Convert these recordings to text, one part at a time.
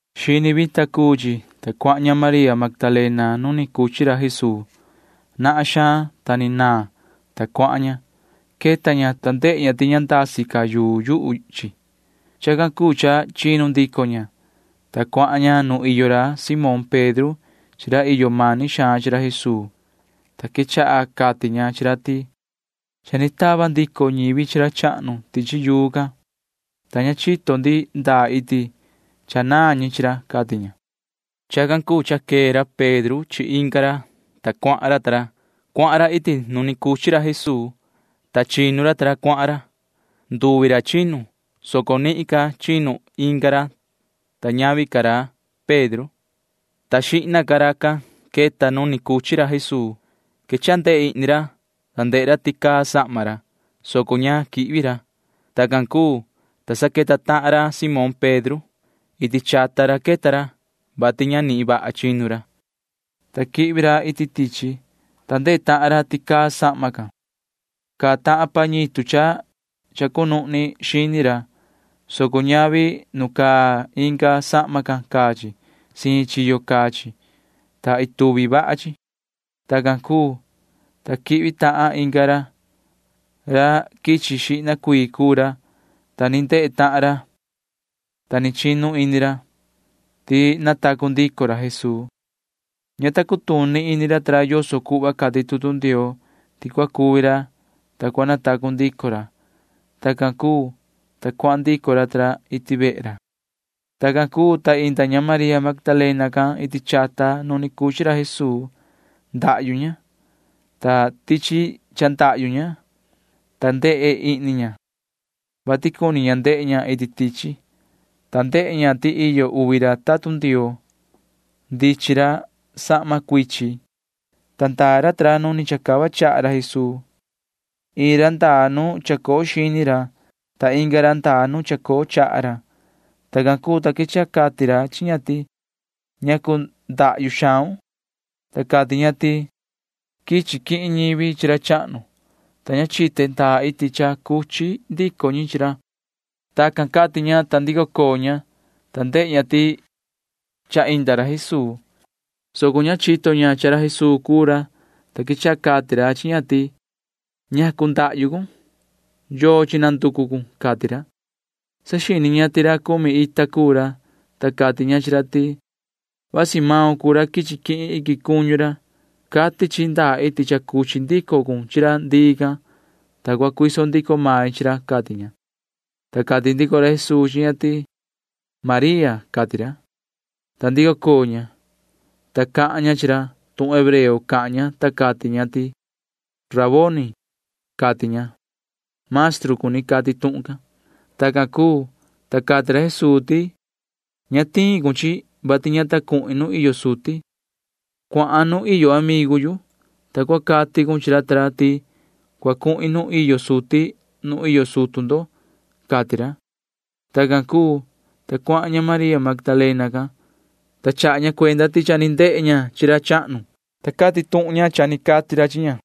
Xini vita cuu chi, ta cuahan ña María Magdalena nu ni cuchi ra Jesuu. Nahan xaan, ta ni vii naan, ta cuahan ña. Queta ña, ta ndehe ña ti ña ndasi ca yuu yuhu chi. Chacan cuu cha chinu ndico ña, ta cuahan ña nu iyo ra Simón Pedro chi ra iyo mani xaan chi ra Jesuu, ta quechaha cati ña chi ra ti: ―Cha ni tava ndico ñivi chi ra chahnu tichi yuu can, ta ña chito ndi ndaa iti chanaan ñi chi ra ―cati ña. Chacan cuu cha quee ra Pedro chi tahan ra, ta cuahan ra. Cuahan ra iti nu ni cuchi ra Jesuu, ta chinu ra ta ra cuahan ra. Nduvi ra chinu, soco nihin ca chinu inga ra, ta queta xihna ra nu ni cuchi ra Jesuu. Quechaha ndehe ihni ra, ta ndehe ra ti caa sahma, soco ña quihvi ra. Tacan cuu, ta queta tahan ra Simón Pedro. Iti chata ra quichi ra, [vati ña nihin vaha chinu ra,] ta quihvi ra iti tichi, ta ndehe tahan ra ti caa sahma can. Caa tahan pañitu cha cunuhni xini ra, soco ña caa chi nu caa inga sahma. Caa siin chi iin chiyo, ta ituvi vaha chi. Tacan cuu, ta quihvi tahan inga ra. Ra quichi xihna cuii cuu ra, ta ni ndehe tahan ra, ta ni chinu ini ra [ti cha natacu ndico ra Jesuu]. Ña ta cutuni ini ra ta ra yoso cuhva cati tutu Ndioo ti cua cuvi ra, ta cua natacu ndico ra. Tacan cuu, ta cuahan ndico ra ta ra iti vehe ra. Tacan cuu, ta inda ña María Magdalena can iti chata nu ni cuchi ra Jesuu. Ndahyu ña. Ndahyu ña, ta ndehe ihni ña, vati cuni ndehe ña iti tichi, ta ndehe ña ti iyo uvi tatun Ndioo. Ndichin ra sahma cuichin, ta ndaa ra nu ni chacava ra Jesuu. Iin ra ndaa nu chacoo xini ra, ta inga ra ndaa nu chacoo chaha ra. Tacan cuu, ta quechaha cati ra chi ña ti: ―Yoho sihi, ¿ñacu ndahyu xaun? Ta cati ña chi ra ti: ―Quichi quihin ñivi chi ra chahnu, ta ña chite ndaa iti cha cuchi ndico ñi chi ra. Tacan cati ña, ta ndico coo ña, ta ndehe ña ti cha inda ra Jesuu, soco ña chito ña cha ra Jesuu cuu ra, ta quechaha cati ra chi ña ti: ―¿Ñacu ndahyu cun, ta sihi? ¿Yochi nanducu cun? ―cati ra. Saxini ña ti ra cumi ita cuu ra, ta cati ña chi ra ti: ―Vasi maun cuu ra quichi quihin iquin cuñu ra, taa. Cua cati cun chihin yu ndaa iti cha cuchi ndico cun chi ra ndii can, ta cua cuiso ndico main chi ra inga chiyo ―cati ña. Ta cati ndico ra Jesuu chi ña ti: ―¡María! ―cati ra. Ta ndico coo ña, ta cahan ña chi ra. Tuhun hebreo cahan ña, ta cati ña ti: ―¡Raboni! ―cati ña. Maestru cuni cati tuhun can. Tacan cuu, ta cati ra Jesuu ti: ―Ña tiun chihin yu, vati ña ta cuhin nuun iyo suti. Cuahan nuun iyo ra amigu yu, ta cua cati cun chi ra ti cua cuhin nuun iyo suti nu iyo sutu ndo ―cati ra. Tacan cuu, ta cuahan ña María Magdalena can, ta chaha ña cuenda ti cha ni ndehe ña chi ra chahnu, ta chaha ña cuenda ñaan tuhun cha ni cati ra chi ña.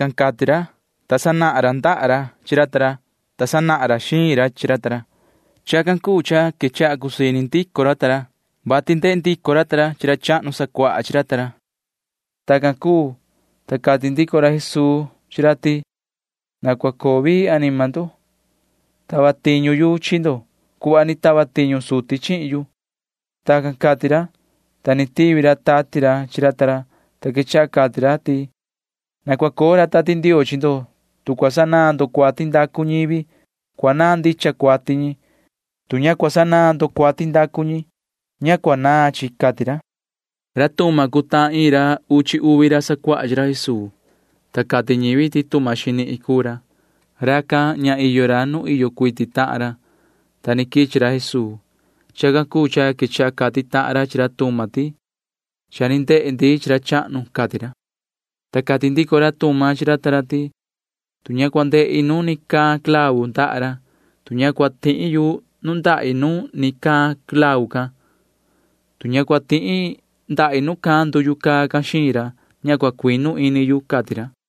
Tacan cati ra, ta sanahan ra ndaha ra chi ra ta ra, ta sanahan ra xiin ra chi ra. Chacan cuu cha quechaha cusii ndico ini racan ta ra, vati ndehe ndico ra chi ra chahnu sacuaha chi ra. Tacan cuu, ta cati ndico ra Jesuu chi ra ti: ―Na cua coo vii anima ndo. Tava tiñu yu chi ndo cuhva ni tava tiñu suti chihin yu. Tacan cati ra, ta ni tivi ra tati ra chi ra, ta quechaha cati ra ti: ―Na cua coo ra Tati Ndioo chi ndo. Tu cua sanaan ndo cuati ndacu ñivi, cua naan ndicha cuati ñi. Tu ña cua sanaan ndo cuati ndacu ñi, ña cua naan chi ―cati ra. Ta ra Tuma cuu tahan ra iin ra uchi uvi ra sacuaha chi ra Jesuu, ta cati ñivi ti Tuma xinihin cuu ra. Racan ña iyo ra nu iyo cuiti tahan ra, ta ni quichi ra Jesuu. Chacan cuu cha quechaha cati tahan ra chi ra Tuma ti: ―Cha ni ndehe ndi chi ra chahnu ―cati ra. Ta cati ndico ra Tuma chi ra ti: ―Tu ña cua ndehi nu ni caan clavu ndaha ra, tu ña cua tihi nundahi nu ni caan clavu can, tu ña cua tihi ndahi nu caan nduyu xiin ra, ña cua cuinu ini yu ―cati ra.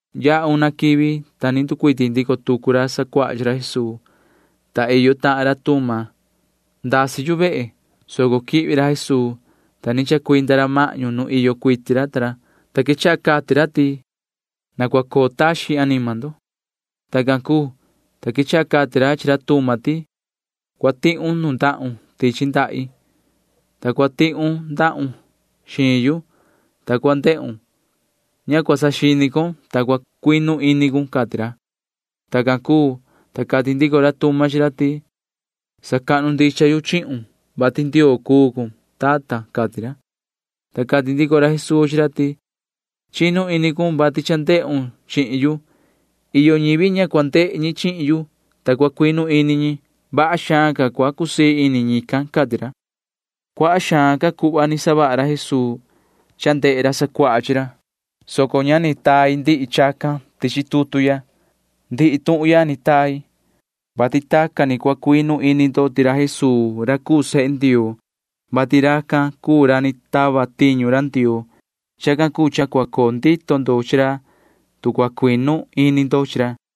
Yaha una quivi, ta ni nducuiti ndico tucu ra sacuaha chi ra Jesuu, ta iyo tahan ra Tuma. Ndasi ndico tucu yu vehe, soco quihvi ra Jesuu, ta ni chacuinda ra mahñu nu iyo cuiti ra, ta quechaha cati ra ti: ―Na cua coo taxin anima ndo. Tacan cuu, ta quechaha cati ra chi ra Tuma ti: ―Ihya tichi ndahi cua tihun nundahun, ta cua tihun ndahun tihya xiin yu, ta cua ndehun. Ña cua saxini con, soco cua cuinu ini cun ―cati ra. Tacan cuu, ta cati ndico ra Tuma chi ra ti: ―Sacahnu ndicha yu chihun, vati Ndioo cuun, tata ―cati ra. Ta cati ndico ra Jesuu chi ra ti: ―Chinu ini cun, vati cha ndehun chihin yu. Iyo ñivi ña cua ndehe ñi chihin yu, ta cua cuinu ini ñi. Vaha xaan ca cua cusii ini ñican ―cati ra. Cuaha xaan ca cuhva ni savaha ra Jesuu ndehe ra sacuaha chi ra, soco ña ni tai ndihi chacan tichi tutu ya. Ndihi tuhun ya ni tai, vati tacan ni cua cuinu ini ndo ti ra Jesuu cuu sehe Ndioo, vati racan cuu ra ni tava tiñu ra Ndioo. Chacan cuu cha cua coo ndito ndo chi ra, tu cua cuinu ini ndo chi ra.